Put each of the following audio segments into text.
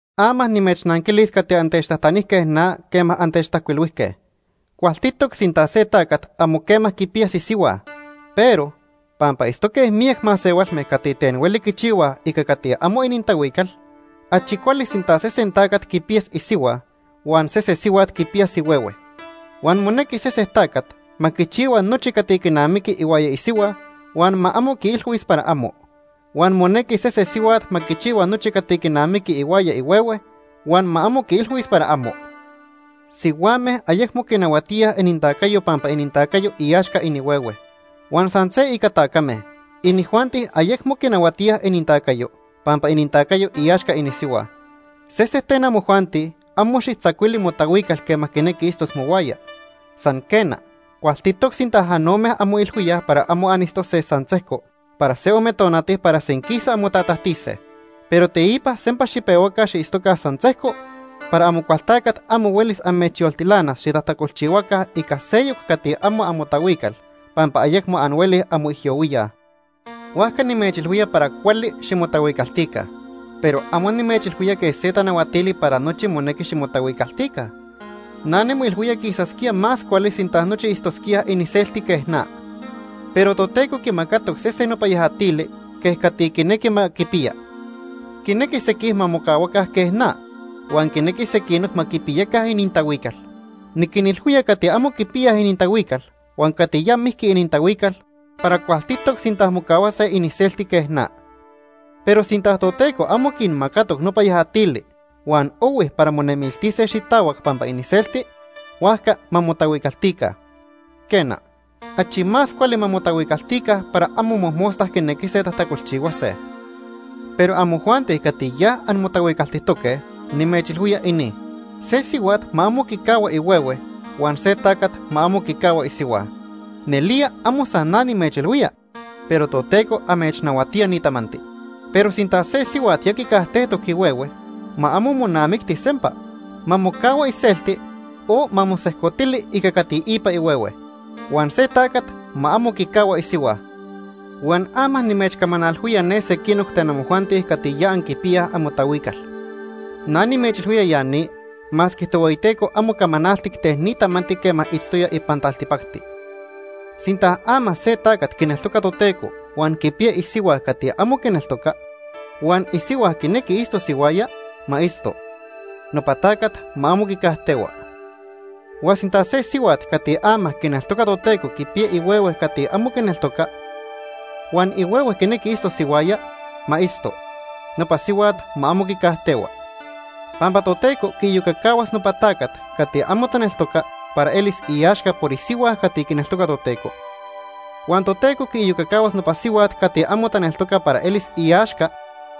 Ama nimechnanquilis cati antechtajtanijque na quema antechtajcuilhuijque. Cualtitoc sinta se tacat amo quema quipiyas isihua. Pero, pampa itztoque miyac masehualme cati ten hueli quichihuaj ica cati amo inintahuical, achi cuali sinta sesen tacat quipiyas isihua, huan sese sihuat quipiyas ihuehue. Huan monequi sesen tacat ma quichihua nochi cati quinamiqui ihuaya isihua huan ma amo quiilhuis para amo. Huan monequi sese sihuat ma quichihua nochi cati quinamiqui ihuaya ihuehue huan ma amo quiilhuis para amo. Sihuame ayecmo quinahuatíaj inintacayo pampa inintacayo iaxca inihuehue. Huan san se ica tacame, inijuanti ayecmo quinahuatíaj inintacayo pampa inintacayo iaxca inisihua. Sesen ten amojuanti amo xijtzacuili motahuical quema quinequi itztos mohuaya. San quena, cualtitoc sinta anome anmoilhuíaj para amo anitztose san sejco para se ome tonati para senquisa anmotatajtise. Pero teipa sempa xipehuaca xiitztoca san sejco para Amocualtacat amo huelis amechyoltilanas xitajtacolchihuaca ica seyoc cati amo amotahuical pampa ayecmo anhuelij anmoijyohuíaj. Huajca nimechilhuía para cuali ximotahuicaltica, pero amo nimechilhuía quej se tanahuatili para nochi monequi ximotahuicaltica. Na nimoilhuía quisasquía más cuali sinta nochi itztosquíaj iniselti quej na. Pero Toteco quimacatoc sesen nopa yajatili quej cati quinequi ma quipiya. Quinequi sequij ma mocahuaca quej na, huan quinequi sequinoc ma quipiyaca inintahuical. Niquinilhuía cati amo quipiyaj inintahuical huan cati ya mijqui inintahuical para cualtitoc sinta mocahuase iniselti quej na. Pero sinta Toteco amo quinmacatoc nopa yajatili huan ohui para monemiltise xitahuac pampa iniselti, huajca ma motahuicaltica. Quena, achi más cuali ma motahuicaltica para amo mojmosta quinequise tajtacolchihuase. Pero amojuanti cati ya anmotahuicaltijtoque, nimechilhuía ini. Se sihuat ma amo quicahua ihuehue huan se tacat ma amo quicahua isihua. Nelía amo san na nimechilhuía, pero Toteco amechnahuatía ni tamanti. Pero sinta se sihuat ya quicajtejtoc ihuehue, ma amo monamicti sempa. Ma mocahua iselti o ma mosejcotili ica cati ipa ihuehue. Huan se tacat ma amo quicahua isihua. Huan ama nimechcamanalhuía ne sequinoc ten amojuanti cati ya anquipiyaj amotahuical. Na nimechilhuía ya ni masque Tohueyiteco amo camanaltic ten ni tamanti quema itztoya ipan taltipacti. Sinta ama se tacat quineltoca Toteco huan quipiya isihua cati amo quineltoca, huan isihua quinequi itztos ihuaya, ma itzto. Nopa tacat ma amo quicajtehua. Huan sinta se sihuat cati ama quineltoca Toteco quipiya ihuehue cati amo quineltoca, huan ihuehue quinequi itztos ihuaya, ma itzto. Nopa sihuat ma amo quicajtehua. Pampa Toteco quiiyocacahuas nopa tacat cati amo taneltoca para elis iaxca por isihua cati quineltoca Toteco. Huan Toteco quiiyocacahuas nopa sihuat cati amo taneltoca para elis iaxca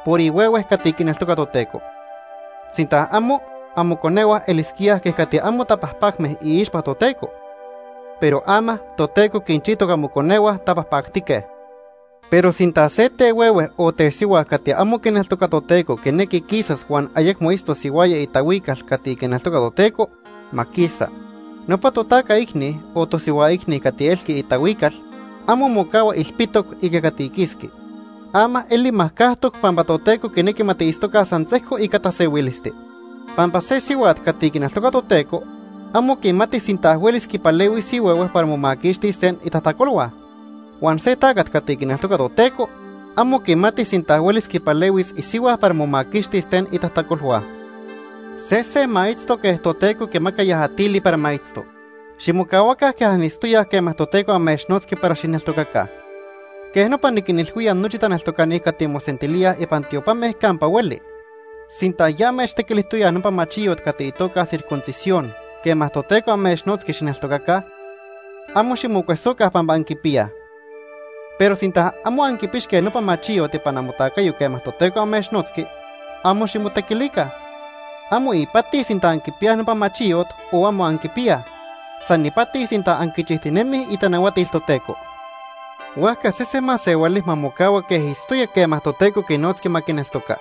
por ihuehue cati quineltoca Toteco. Sinta amo, amoconehua elisquíaj quej cati amo tapajpacme iixpa Toteco, pero ama Toteco quinchijtoc amoconehua tapajpactique. Pero sinta se tehuehue o tesihua cati amo quineltoca Toteco quinequi quisas huan ayecmo itztos ihuaya itahuical cati quineltoca Toteco, ma quisa. Nopa totaca icni o tosihua icni cati elqui itahuical amo mocahua ilpitoc ica cati quisqui. Ama eli majcajtoc pampa Toteco quinequi ma tiitztoca san sejco ica tasehuilisti. Pampa se sihuat cati quineltoca Toteco, amo quimati sinta huelis quipalehuis ihuehue para momaquixtis ten itajtacolhua. Huan se tacat cati quineltoca Toteco, amo quimati sinta huelis quipalehuis isihua para momaquixtis ten itajtacolhua. Sesen ma itzto quej Toteco quimaca yajatili para ma itzto. Ximocahuaca quej anitztoyaj quema Toteco amechnotzqui para xijneltocaca. Quej nopa niquinilhuía nochi taneltocani cati mosentilíaj ipan tiopame campa hueli. Sinta ya amechtequilijtoyaj nopa machiyot cati itoca circuncisión quema Toteco amechnotzqui xijneltocaca, amo ximocuesoca pampa anquipiyaj. Pero sinta amo anquipixque nopa machiyot ipan amotacayo quema Toteco amechnotzqui, amo ximotequilica. Amo ipati sinta anquipiyaj nopa machiyot o amo anquipiyaj, san ipati sinta anquinchijtinemij itanahuatil Toteco. Huajca sese masehuali ma mocahua quej itztoya quema Toteco quinotzqui ma quineltoca.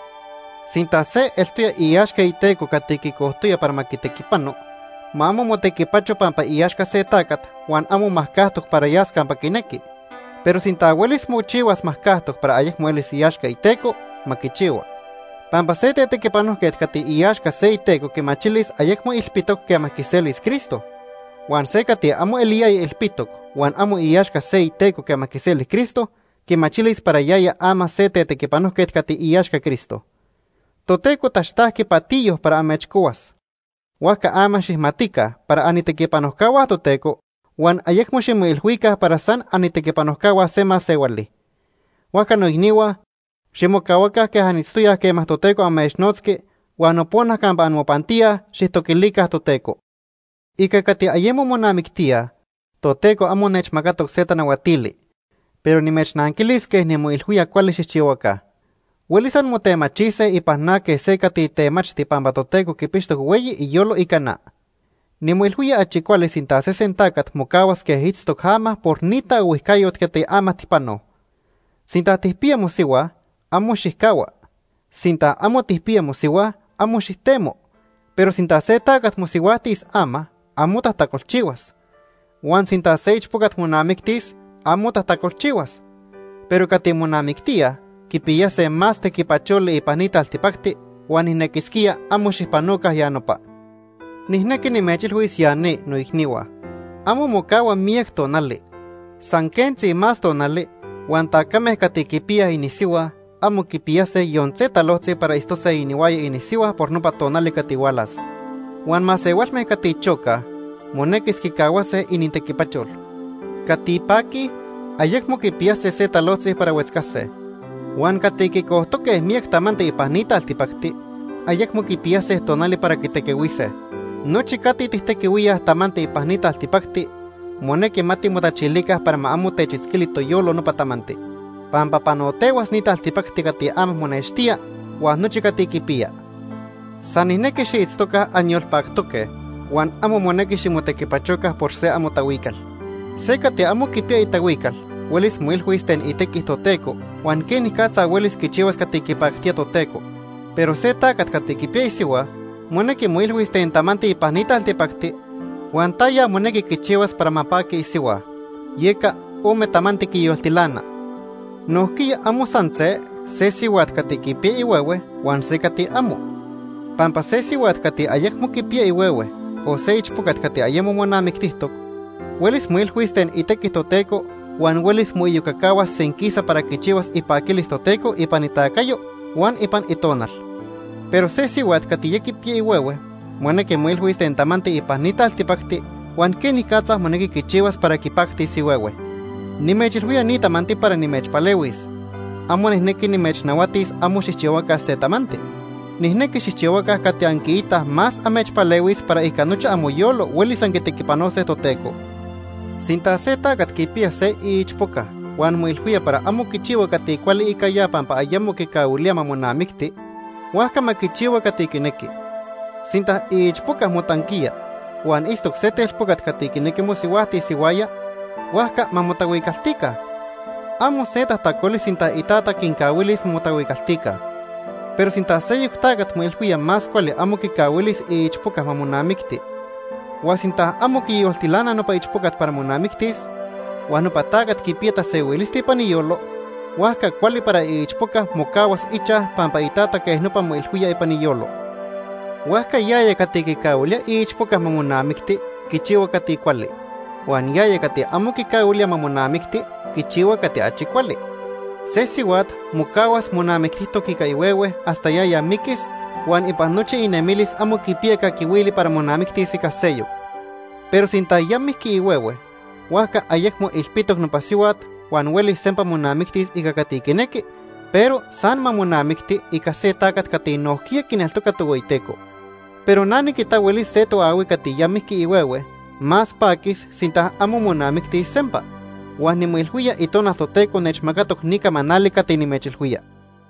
Sinta se eltoya iaxca iteco cati quicojtoya para ma quitequipano, ma amo motequipacho pampa iaxca se tacat huan amo majcajtoc para yas campa quinequi. Pero sinta huelis mochihuas majcajtoc para ayecmo elis iaxca iteco, ma quichihua. Pampa se tetequipanojquet cati iaxca se iteco quimachilis ayecmo ilpitoc quema quiselis Cristo. Huan se cati amo eliyaya ilpitoc huan amo iaxca se iteco quema quiseli Cristo, quimachilis para yaya ama se tetequipanojquet cati iaxca Cristo. Toteco taxtajqui patiyo para amechcohuas, huajca ama xijmatica para anitequipanojcahua Toteco huan ayecmo ximoilhuica para san anitequipanojcahua se masehuali. Huajca noicnihua, ximocahuaca quej anitztoyaj quema Toteco amechnotzqui huan nopona campa anmopantíaj, xijtoquilica Toteco. Ica cati ayemo monamictíaj, Toteco amo nechmacatoc se tanahuatili, pero nimechnanquilis quej nimoilhuía cuali xijchihuaca. Huelis anmotemachise ipan na quej se cati temachti pampa Toteco quipixtoc hueyi iyolo ica na. Nimoilhuía achi cuali sinta sesen tacat mocahuas quej itztoc ama por ni taohuijcayot cati ama tijpanoj. Sinta tijpiya mosihua, amo xijcahua. Sinta amo tijpiya mosihua, amo xijtemo. Pero sinta se tacat mosihuajtis ama, amo tajtacolchihuas. Huan sinta se ichpocat monamictis, amo tajtacolchihuas. Pero cati monamictíaj quipiyase más tequipacholi ipan ni taltipacti huan nijnequisquía amo xijpanoca ya nopa. Nijnequi nimechilhuis ya ni, noicnihua. Amo mocahua miyac tonali. San quentzi más tonali huan tacame cati quipiyaj inisihua amo quipiyase yon se talojtzi para itztose inihuaya inisihua por nopa tonali cati hualas. Huan masehualme cati chocaj monequis quicahuase inintequipachol. Cati paquij, ayecmo quipiyase se talojtzi para huetzcase. Huan cati quicojtoque miyac tamanti ipan ni taltipacti, ayecmo quipiyase tonali para quitequihuise. Nochi cati tijtequihuíaj tamanti ipan ni taltipacti, monequi ma timotachilica para ma amo techitzquili toyolo nopa tamanti, pampa panotehuas ni taltipacti cati ama monextía huan nochi cati quipiya. San nijnequi xiitztoca anyolpactoque huan amo monequi ximotequipachoca por se amotahuical. Se cati amo quipiya itahuical huelis moilhuis ten itequi Toteco huan quenicatza huelis quichihuas cati quipactía Toteco, pero se tacat cati quipiya isihua, monequi moilhuis ten tamanti ipan ni taltipacti huan taya monequi quichihuas para ma paqui isihua. Yeca ome tamanti quiyoltilana. Nojquiya amo san se, se sihuat cati quipiya ihuehue huan se cati amo. Pampa se sihuat cati ayecmo quipiya ihuehue, o se ichpocat cati ayemo monamictijtoc huelis moilhuis ten itequi Toteco huan huelis moiyocacahuas senquisa para quichihuas ipaquilis Toteco ipan itacayo huan ipan itonal. Pero se sihuat cati ya quipiya ihuehue monequi moilhuis ten tamanti ipan ni taltipacti huan quenicatza monequi quichihuas para quipactis ihuehue. Nimechilhuía ni tamanti para nimechpalehuis. Amo nijnequi nimechnahuatis amo xijchihuaca se tamanti. Nijnequi xijchihuaca cati anquiitaj más amechpalehuis para ica nochi amoyolo huelis anquitequipanose Toteco. Sinta se tacat quipiya se iichpoca huan moilhuía para amo quichihua cati cuali ica ya pampa ayemo quicahuilía ma monamicti, huajca ma quichihua cati quinequi. Sinta iichpoca motanquiya huan itztoc se telpocat cati quinequi mosihuajtis ihuaya, huajca ma motahuicaltica. Amo se tajtacoli sinta itata quincahuilis ma motahuicaltica. Pero sinta seyoc tacat moilhuía más cuali amo quicahuilis iichpoca ma monamicti, huan sinta amo quiyoltilana nopa ichpocat para monamictis, huan nopa tacat quipiya tasehuilisti ipan iyolo, huajca cuali para iichpoca mocahuas ichaj pampa itata quej nopa moilhuía ipan iyolo. Huajca yaya cati quicahuilía iichpoca ma monamicti quichihua cati cuali, huan yaya cati amo quicahuilía ma monamicti quichihua cati achi cuali. Se sihuat mocahuas monamictijtoc ica ihuehue hasta yaya miquis huan ipan nochi inemilis amo quipiya caquihuili para monamictis ica seyoc. Pero sinta ya mijqui ihuehue, huajca ayecmo ilpitoc nopa sihuat huan huelis sempa monamictis ica cati quinequi, pero san ma monamicti ica se tacat cati nojquiya quineltoca Tohueyiteco. Pero na niquita huelis se toahui cati ya mijqui ihuehue más paquis sinta amo monamictis sempa, huan nimoilhuía Itonal Toteco nechmacatoc ni camanali cati nimechilhuía.